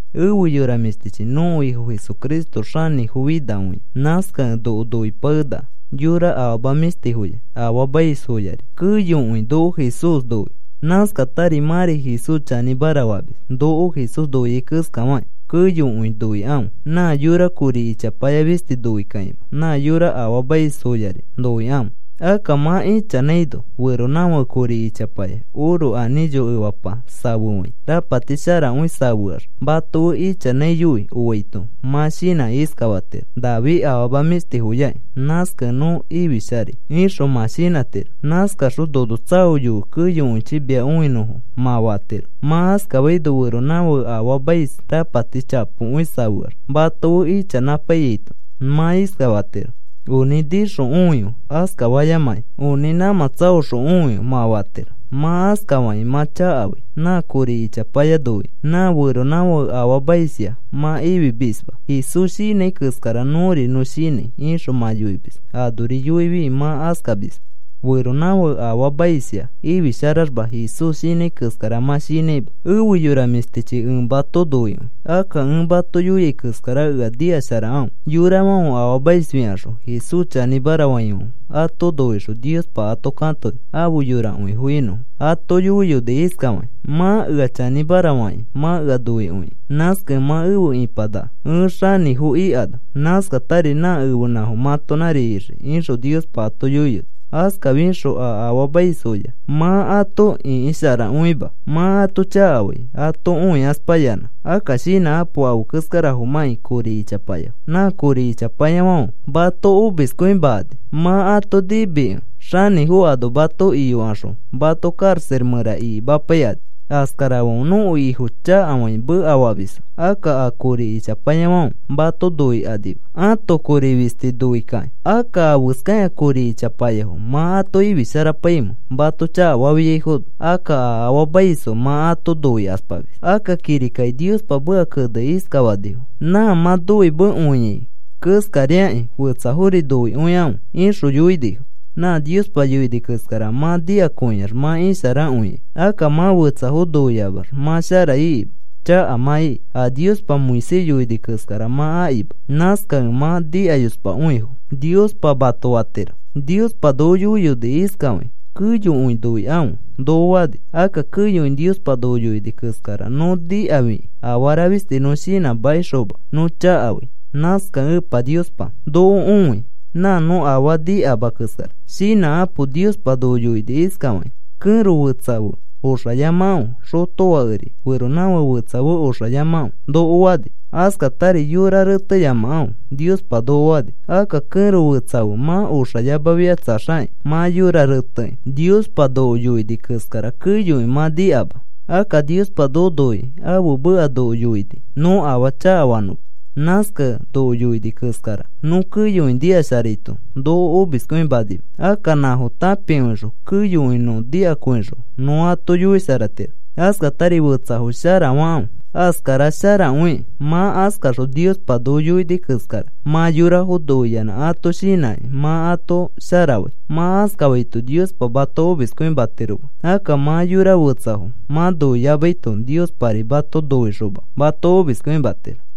Efe yora mĩshtichi, nõko Ifo Jesucristo xanĩfofinakõia. Nãskakẽ noko noipakenaka. Yora afama mĩshtifoya, afaamaisfoyari keyokõi noko Jesús noi. Nãskatari mãri Jesús chanĩmara famis, noko Jesús noiai keskafakĩ, keyokõi noikãfe. Nã yora kori ichapaya fisti noikakĩma, nã yora afaamaisfoyari noikãfe. Akka mã ichanãino feronãfake kori ichapaya oro anĩcho efapa safefãi rapati sharakõi safeax mato fe ichanãiyoi oaito, mã shinãkĩ iskafatiro: “Nafi afama mĩshtifoyaki, nãskakẽ nõ ifisharai,” ixõ mã shinãtiro. Nãskaxõ, “Nono tsaoyofe keyokõichi mia õinõfo,” mã fatiro. Mã askafaino, feronãfake afaamais rapati chapokõi safeax mato fe ichanãpaiyaito mã iskafatiro: “Onĩ nĩxõ õife,” askafayamakĩ, “Onĩ nãmã tsaoxõ õife,” mã fatiro. Mã askafakĩ mã chakafai. Nã kori ichapaya noikĩ nã feronãfake afaamaisya mã ifimisma. “Jesús shinãi keskara nõri nõ shinãi,” ixõ mã yoimis. Anori yoifi mã askamisma. Feronãfake afaamaisya ifisharaxma Jesús shinãi keskara mã shinãima. Efe yora mĩshtichi, ẽ mato noikõi. Akka ẽ mato yoiai keskara ea nikasharakãfe. Yorafãfe afaamaisfikaxõ, Jesús chanĩmara faifãfe ato noixõ Niospa ato katoni afe yorakõifo inõfo. Ato yoiyoni iskafakĩ: “Mã ea chanĩmara fakĩ, mã ea noikõi. Nãskakẽ mã efe ipanaka ẽ xanĩfo ika ano. Nãskatari nã ẽfenãfo mãtonãri ixii,” ixõ Niospa ato yoiyoni. Askafixõ a afaamaisfoya mã ato ĩkisharakõima, mã ato chakafai ato õikaspayanã. Akka shinãkapo afe keskarafomãkĩ kori ichapayafo. Nã kori ichapayafãfe mato omiskõimakani. Mã ato nimikẽ xanĩfo ano mato iyokaxõ mato karaxa mẽra ikimapaikani. Askarafãfe nõko Ifo chakafakĩ mekafamisfo. Akka a kori ichapayafãfe mato noikanima ato kori fisti noi kakĩ. Akka, ¿afeskakĩ a kori ichapayafo mã ato ifisharapaimẽ mato chakafafiaifono? Akka a afaamaisfo mã ato noikaspamis. Akka kirikaki Niospa meka kenekĩ iskafanifo: “Nã mã noimekõiai keskariakĩ fetsafori noikõikãfe,” ixõ yoinifo. Nã Niospa yoini keskara mã nikakõiax mã isharakõikai. Akka mã fetsafo noiamax mã shara ikima, chaka mã iki. A Niospa Moisés yoini keskara mã akima. Nãskakẽ, “Mã nikayospakõifo,” Niospa mato fatiro. Niospa noko yoiyoni iskafakĩ: “Keyokõi noikãfe,” noko fani. Akka keyokõi Niospa noko yoini keskara nõ nikafikĩ afara fisti nõ shinãmakixoma nõ chakafai. Nãskakẽ Epa Niospa noko õi nã nõ afaa nikama keskara. Shinãkãpo. Niospa noko yoini iskafakĩ: “Kẽro fetsa fe oxayamakãfe. Xotofakeri feronãfake fetsa fe oxayamakãfe,” noko fani. Askatari, “Yora reteyamakãfe,” Niospa noko fani. Akka kẽro fetsa fe mã oxayamafikatsaxakĩ mã yora retekĩ Niospa noko yoini keskara keyokõi mã nikama. Akka Niospa noko noikĩ, ãfe meka noko yoini nõ afaa chakafanõma. Nãskakẽ noko yoini keskara, nõ keyokõi nikasharaito noko omiskõimanima. Akka nãfo tãpikõixõ, keyokõi nõ nikakõixõ nõ ato yoisharatiro. Askatari fetsafo sharafakãfe, askara sharakõikĩ. Mã askaxõ Niospa noko yoini keskara, mã yorafo noiyanã ato shinãkĩ mã ato sharafai. Mã askafaito Niospa mato omiskõimatiroma. Akka mã yora fetsafo mã noiyamaito Niospari mato noixoma mato omiskõimatiro.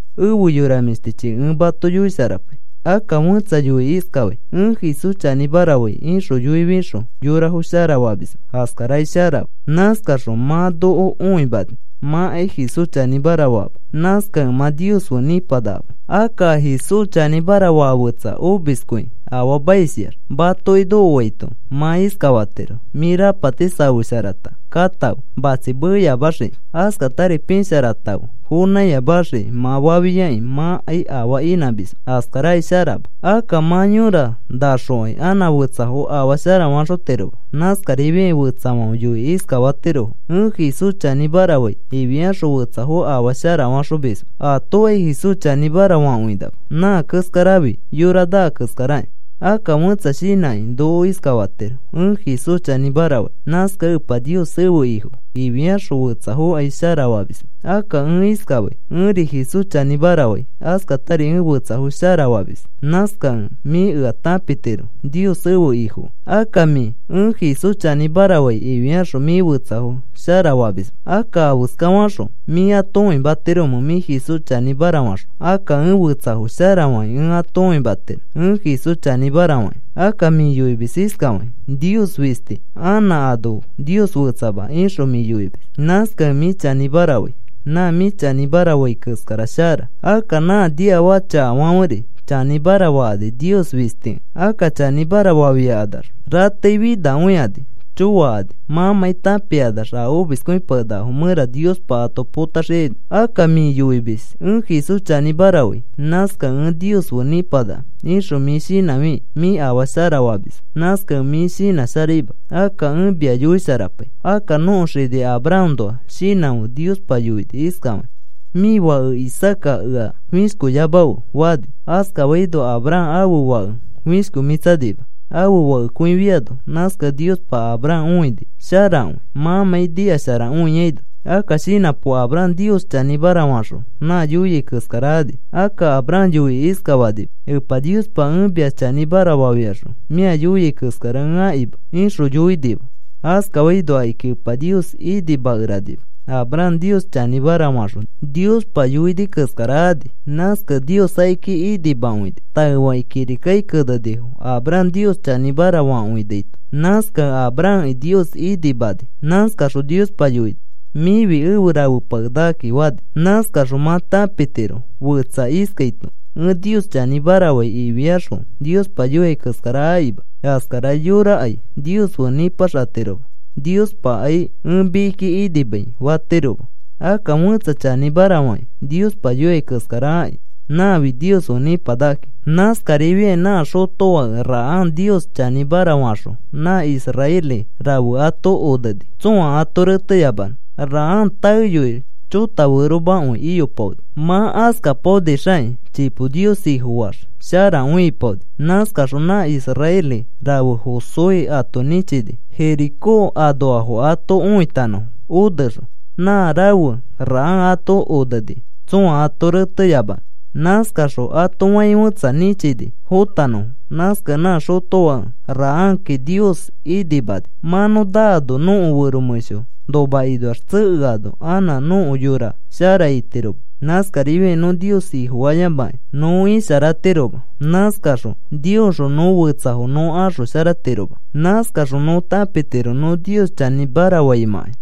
Efe yora mĩshtichi, ẽ mato yoisharapai. Akka fẽtsa yoikĩ iskafai: “Ẽ Jesús chanĩmara fai,” ixõ yoifixõ yorafo sharafamisma, askarakai sharama. Nãskaxõ mã noko õimani mãkai Jesús chanĩmara faama. Nãskakẽ mã Nios fe nĩpanakama. Akka a Jesús chanĩmara faa fetsa omiskõi afaamaisyax matoki nokoaito, mã iskafatiro: “Mĩ rapati safesharata katãfe, matsi meyamaxiki. Askatari pisharatãfe fonãiyamaxiki,” mã fafiakĩ mãkai afaa inãmisma, askarakai sharama. Akka mã yõra nãxokai anã fetsafo afaa sharafaxotiroma. Nãskarifiakĩ fetsafãfe yoikĩ iskafatirofo: “Ẽ Jesús chanĩmara fai,” ifiaxõ fetsafo afaa sharafaxomisma atokai Jesús chanĩmara fakõinama. Nã keskarafi yora naa keskarakĩ. Akka fẽtsa shinãkĩ noko iskafatiro: “Ẽ Jesús chanĩmara fai. Nãskakẽ Epa Nios ẽfe Ifo,” ifiaxõ fetsafokai sharafamisma. Akka ẽ iskafai: “Ẽri Jesús chanĩmara fai. Askatari ẽ fetsafo sharafamis. Nãskakẽ mĩ ea tãpitiro Nios ẽfe Ifokẽ.” Akka mĩ, “Ẽ Jesús chanĩmara fai,” ifiaxõ mĩ fetsafo sharafamisma. Akka, ¿afeskafaxõ mĩ ato õimatiromẽ mĩ Jesús chanĩmara faxõ? Akka ẽ fetsafo sharafakĩ ẽ ato õimatiro ẽ Jesús chanĩmara fakĩ. Akka mĩ yoimis iskafakĩ: “Nios fisti, anã ano Nios fetsama,” ixõ mĩ yoimis. Nãskakẽ mĩ chanĩmara fai. Nã mĩ chanĩmara fai keskara shara. Akka nã niafaka chakafãferi chanĩmara fakani Nios fistikẽ. Akka chanĩmara fafiakanax rateifinakõikani choakani mãmãi tãpikanax a omiskõipakenakafo mẽra Niospa ato potaxiaino. Akka mĩ yoimis: “Ẽ Jesús chanĩmara fai. Nãskakẽ ẽ Nios fe nĩpanaka,” ixõ mĩ shinãfikĩ, mĩ afaa sharafamisma. Nãskakẽ mĩ shinãsharaima. Akka ẽ mia yoisharapai. Akka nõko xini Abrahamnoa shinãfe. Niospa yoini iskafakĩ: “Mĩ fake Isaaca ea fĩshkoyamafe,” fani. Askafaino Abraham ãfe fake fishkomĩtsanima, ãfe fakekõifiano. Nãskakẽ Niospa Abraham õini sharakõi mãmãi nikasharakõiaino. Akka shinãpo. Abraham Nios chanĩmara faxõ nã yoiai keskara ani. Akka Abraham yoikĩ iskafanima: “Epa Niospa, ẽ mia chanĩmara fafiaxõ mĩa yoiai keskara ẽ akima,” ixõ yoinima. Askafaino akiki Epa Nios inimakeranima. Abraham Nios chanĩmara faxõ, Niospa yoini keskara ani. Nãskakẽ Nios akiki inimakõini. Taefakĩ kirika kenenifo Abraham Nios chanĩmara fakõinaito. Nãskakẽ Abrahamki Nios inimani. Nãskaxõ Niospa yoini: “Mĩfi efe rafepakenakakĩ,” fani. Nãskaxõ mã tãpitiro fetsa iskaito: “Ẽ Nios chanĩmara fai,” ifiaxõ Niospa yoia keskara akima, askara yorakai Nios fe nĩpaxatiroma. Niospakai, “Ẽ mikiki inimai,” fatiroma. Akka fẽtsa chanĩmara fakĩ, Niospa yoia keskara aki, nãfi Nios fe nĩpanakakĩ. Nãskarifiakĩ nã xotofãke Rahab Nios chanĩmara faxõ nã israeli rafe ato oneni tsõa ato reteyamanõ. Rahab taeyoi chota feromakõi iyopaoni. Mã askapaonixakĩ, chipo Nios Ifofaax sharakõi ipaoni. Nãskaxõ nã israeli rafe Josué ato nĩchini Jericó anoafo ato õitanõfo onexõ. Nã rafe Rahab ato oneni tsõa ato reteyamanõ. Nãskaxõ ato fai fẽtsa nĩchini fotanõfo. Nãskakẽ nã xotofake Rahabki Nios inimani. Mã nõ naano, nõko fero mẽsho nomakinoax tsekeano, anã nõko yora shara itiroma. Nãskarifiakĩ nõ Nios Ifofayamakĩ nõ isharatiroma. Nãskaxõ Niosxõ nõ fetsafo nõ axosharatiroma. Nãskaxõ nõ tãpitiro nõ Nios chanĩmara faimãkai.